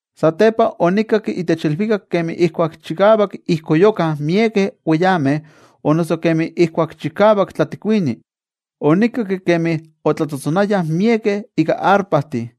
Satepa onikakki itech ilvikak kemi ijkuak chikavak ijkoyukah miekeh weyameh o noso kemi ijkuak chikavak tlatikuini. Onikakki kemi otlatzotzonayah miekeh ika arpajtih.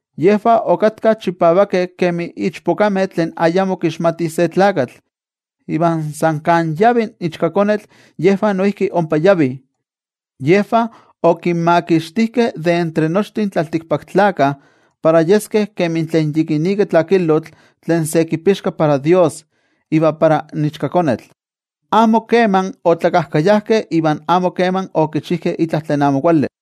Yejvah okatkah chipavakeh kemi ichpokameh tlen ayamo kixmatih se tlakatl. Iva san kan yavi in Ichkakonetl yejvah noijki ompa yavih. Yejvah okinmakixtijkeh de entre nochtin tlaltikpaktlakah, para yeskeh kemi tlen yikinika tlakilotl tlen se kipixka para Dios iva para in Ichkakonetl. Amo kema otlakajkayajkeh iva amo keman okichijkeh itla tlen amo kuali.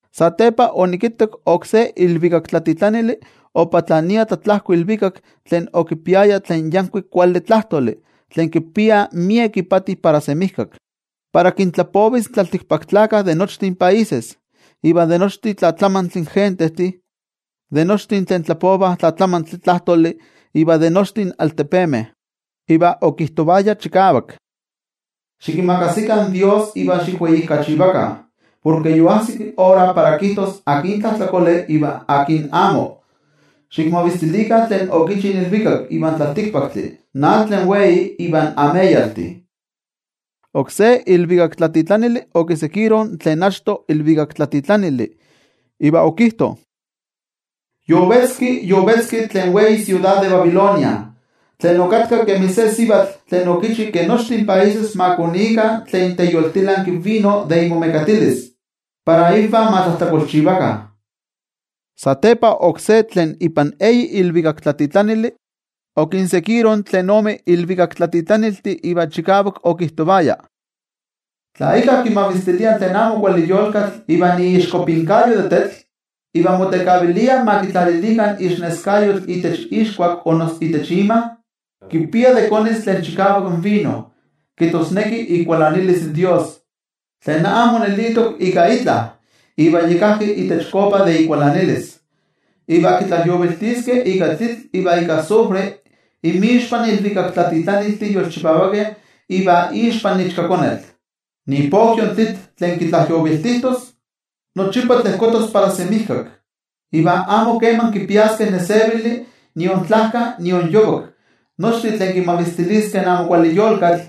Satepa onikittak oksé ilvikaktlatitlanili opatlania tlatlajko ilvikak tlen okipiaya tlen yankuik kuali tlajtoli tlen kipia miek ipati para semijkak, para kintlapovis in tlaltikpaktlakah de nochtin países, de nochi tlatlamantli gentejtih, de nochtin tlen tlapovah tlatlamantli tlajtoli iva de nochtin altepemeh. Iva okijtovaya chikavak: —Xikimakasikah in Dios iva xikweijkachivakah, porke yoajsik ora para kijtos akin tlajtlakole iva akin amo. Xikmavistilikah tlen okichi in ilvikak ivan tlaltikpaktli, in atl tlen wei ivan ameyaltih. Oksé ilvikaktlatitlanili okiseguiro tlen achto ilvikaktlatitlanili iva okijto: —Yovetzki, yovetzki tlen wei siudad de Babilonia, tlen okatka kemi se sivatl tlen okichi ke nochtin países ma konikah tlen teyoltilanki vino de imomekatilis para ivan ma tlajtlakolchivakah. Satepa oksé tlen ipan eyi ilvikaktlatitlanili okinseguiro tlen ome ilvikaktlatitlaniltih iva chikavak okijtovaya: —Tla íkka kimavistilia tlen amo kuali yolkatl ivan iixkopinkayo de tetl, iva motekavilia ma kitlalilikah ixneskayotl itech ixkuak o noso itech ima, kipia de konis tlen chikavak vino, kijtosneki ikualanilis Dios, tlen amo nelitok ika itla iva yi kajki itech kopa de ikualanilis. Iva kitlajyoviltiskeh ika tlitl iva ika azufre inmixpan ilvikaktlatitlaniltih yolchipavakeh iva ixpan Ichkakonetl. Ipokyo in tlitl tlen kitlajyoviltijtos, nochipa tlejkotos para semijkak. Iva amo keman kipiaskeh nesevili nion tlajka nion yovak nochtin tlen kimavistiliskeh in amo kuali yolkatl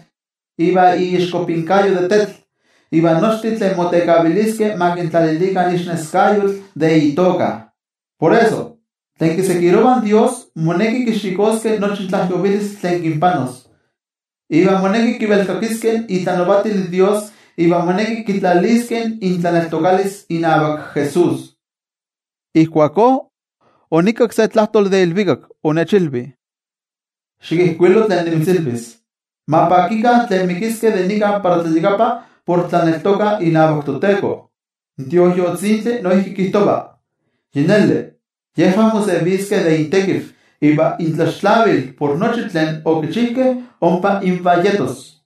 ivan iixkopinkayo de tetl, iva nochtin tlen motekaviliskeh ma kintlalilikah ixneskayotl de itoka. Por eso, tlen kiseguirovah Dios moneki kixikoskeh nochi tlajyovilistli tlen kinpanos, iva moneki kivelkakiskeh itlanavatil Dios iva moneki kitlaliskeh intlaneltokalis inavak Jesús. Ijkuakó onikakki se tlajtoli de ilvikak. Onechilvi: —Xikijkuilo tlen nimitzilvis: “Ma pakikah tlen mikiskeh de nika para tlayakapa por tlaneltokah inavak toTeko.” In Tioijyotzintli noijki kijtova: “Yi neli, yejvah moseviskeh de intekiv, iva intlaxtlavil de nochi tlen okichijkeh ompa invah yetos.”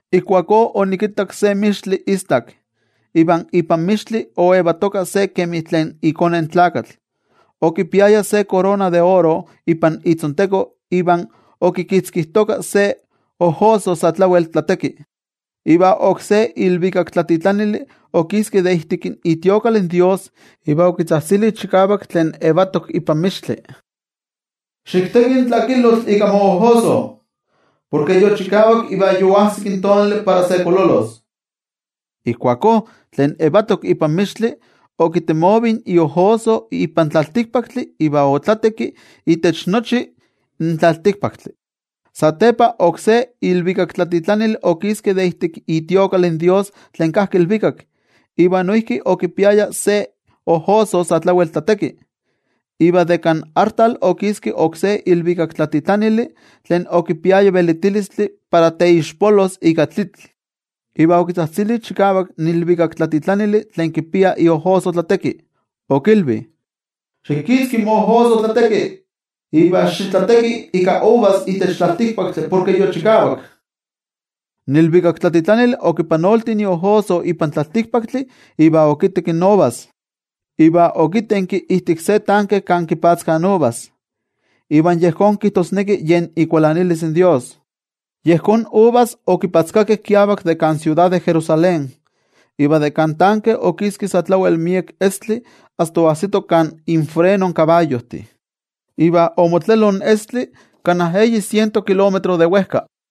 Ijkuakó onikittak se mixtli istak. Iva ipan mixtli oyetoka se kemi tlen iKone in Tlakatl. Okipiaya se korona de oro ipan itzonteko iva okikitzkijtoka se ojoso sa tlawel tlateki. Iva oksé ilvikaktlatitlanili okiski de ijtik itemplo in toYejwatzi iva okitzajtzili chikavak tlen yetok ipan mixtli: —Xikteki in tlakilotl ika moojoso. Porke yochikavak iva yoajsik tonali para se kololos. Ijkuakó tlen yetok ipan mixtli okitemovi iojoso ipan tlaltikpaktli iva otlatekki itech nochi in tlaltikpaktli. Satepa oksé ilvikaktlatitlanili okiski de ijtik itemplo in toYejwatzi tlen kajki ilvikak, iva noijki okipiaya se ojoso sa tlawel tlateki. Iva de kan artal okiski oksé ilvikaktlatitlanili tlen okipiaya velitilistli para teixpolos ika tlitl. Iva okitzajtzili chikavak in ilvikaktlatitlanili tlen kipia iojoso tlateki. Okilvi: —Xikitzki moojoso tlateki, iva xitlateki ika uvas itech tlaltikpaktli porke yochikavak. In ilvikaktlatitlanili okipanolti iojoso ipan tlaltikpaktli iva okitekki in uvas, iva okitenki ijtik se tanke kan kipatzkah in uvas, iva yejón kijtosneki yen ikualanilis in toYejwatzi. Yejón uvas okipatzkakeh kiavak de kan siudad de Jerusalén, iva de kan tanke okiski sa tlawel miek estli asta oajsito kan infreno in kabayojtih, iva omotlelo in estli kana eyi siento kilómetro de wejka.